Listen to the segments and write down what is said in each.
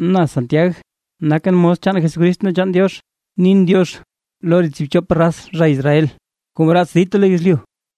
Na Santiag nakʼn mos chaan Jesucrist ne chaan Diox, nin “diox” lo re tsiibchop raz re zha Israel kuu mraats dita lo yezlyu.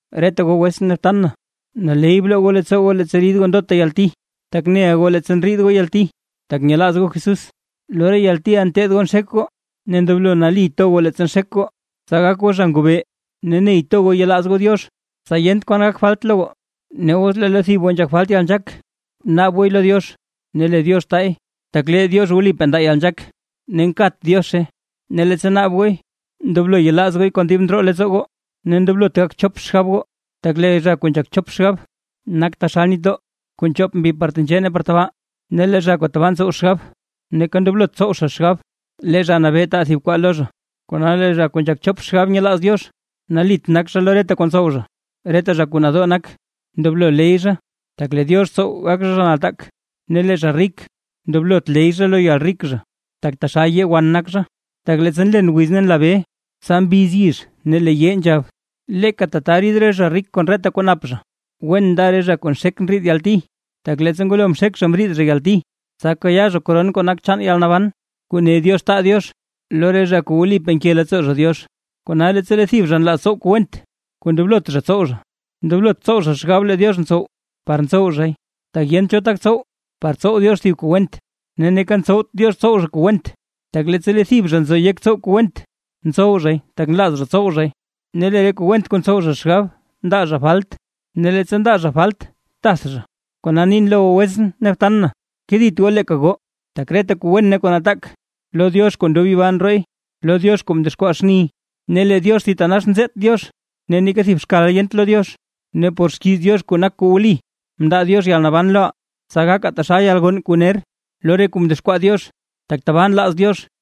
Reta goo wetsʼn ne btan na, naley bloo goo leettsoo goo leettsa rid goo ndota yalti. Tak neʼa goo leettsa ndriid goo yalti tak nyelaaz goo Jesús, lo re yaltiʼa nteed goo nxek goo. Ne ndoblo nali to goo leettsa nxek goo, tsa gak goo zha ngobee ne ney to goo yelaaz goo Diox, tsa yent kwan gak falt lo goo. Ne os lee lo thib goo nzhak falt yalnzhaak, bnaab gooy lo Diox, ne lee Diox taay, tak lee Diox wlipaa ndaa yalnzhaak ne nkat Diozhe. Ne leettsa naab gooy ndoblo yelaaz gooy kon dib ndroo leettsoo goo, ne ndoblot gak chop xgab goo. Tak lee zha kuu nzhak chop xgab, nak taxal nitdoo kuu nchoop mbi par tenzhee ne par tabaa. Ne lee zha kuu tabaa ntsow xgab, neeka ndoblot tsow zha xgab lee Zha Nabee taa thib kwaa lo zha, kona lee zha kuu nzhak chop xgab nyelaaz Diox, nalit nak zha lo reta kuu ntsow zha. Reta zha kuu nadoo nak, ndoblo ley zha, tak lee Diox tsow gak zha, zha nataak; ne lee zha rik ndoblot ley zha lo yalrik zha, tak taxal yee wan nak zha. Tak leettsa nlen wiz ne nla bee, tsa mbiz yizh ne lee yee nzhab. Leeka tata rid re zha rik kon reta kuu nap zha. Wen nda re zha kuu nxek ndriid yalti; tak leettsa ngwalo mxek zha mriid zha yalti, tsa kayaa zha koron kuu nak chaan yalnaban, kuu ne Diox taa Diox lo re zha kuu wlipa nke leettsoo zha Diox. Kona leettsa lee thib zha nlaaz tsow kuu went kuu ndoblot zha tsow zha, ndoblot tsow zha xgab lee Diox ntsow, par tsow zhay; tak yent cho tak tsow, par tsow Diox thib kuu went, ne neeka ntsowt Diox tsow zha kuu went. Tak leettsa lee thib zha nzo yek tsow kuu went, ntsow zhay tak nlaaz zha tsow zhay. Ne lee re kuu went kuu ntsow zha xgab ndaa zha falt; ne leettsa ndaa zha falt tath zha. Kona nin lo goo wetsʼn ne btan na, kedit goo leeka goo. Tak reta kuu wen ne kuu nataak, lo Diox kuu ndob yibaa ndrooy, lo Diox kuu mdexkwaa xni, ne lee Diox thitanax nzeet Diox ne neeka thib xkal yent lo Diox. Ne por xkiiz Diox kuu nak kuu wli mndaa Diox yalnaban loʼaa, tsa gakaa taxal yalgonn kuu ner lo re kuu mdexkwaa Diox, tak tabaa nlaaz Diox.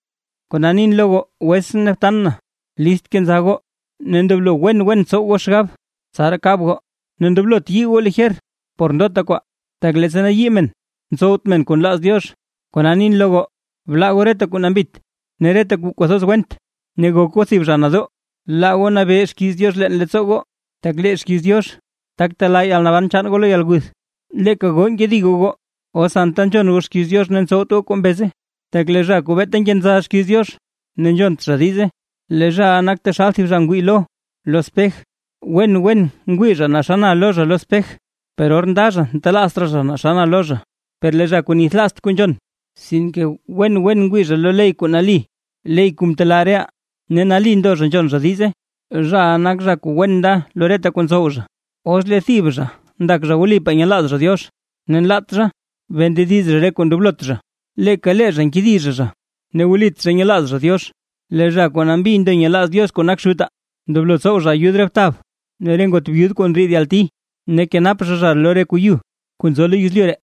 Kona nin lo goo wetsʼn ne btan na, list kenza goo ne ndoblo wen wen tsow goo xgab tsaraa kab goo, ne ndoblot yii goo lijer por ndota kwaa. Tak leettsa nayii men, ntsowt men kuu nlaaz Diox. Kona nin lo goo: Blaa goo reta kuu nambit ne reta kuu kwathoz went. Ne gok goo thib zha nadoo, laa goo nabee xkiiz Diox leen leettsoo goo, tak lee xkiiz Diox, tak telaa yalnaban chaan goo lo yalguth. Leeka goo nkedi goo goo, os anta nzhon goo xkiiz Diox ne ntsowt goo kuu mbeze. Tak lee zha kuu beeta nkenza xkiiz Diox ne nzhont zha diize, lee zhaʼa nak taxal thib zha ngwii lo, lo spej, wen wen ngwii zha naa xa na lo zha lo spej, per or nda zha ntelaazt raa zha naa xa na lo zha. Per lee zha kuu nithlaazt kuu nzhon, sinke wen wen ngwii zha lo ley kuu nali, ley kuu mtelaa reʼaa, ne nali ndo zha nzhon zha diize, zhaʼa nak zha kuu wen nda lo reta kuu ntsow zha. Os lee thib zha ndak zha wlipaa nyelaaz zha Diox, ne nlaat zha bee ndediz zha re kuu ndoblot zha, leeka lee zha nkedi zha zha ne wlit zha nyelaaz zha Diox. Lee zha kuu nambi ndo nyelaaz Diox kuu nak Xutaa: Ndoblo tsow zha ayud re btab ne re ngot byud kuu ndriid yalti, ne kenap zha zha lo re kuu yu kuu nzo lo yezlyu ree.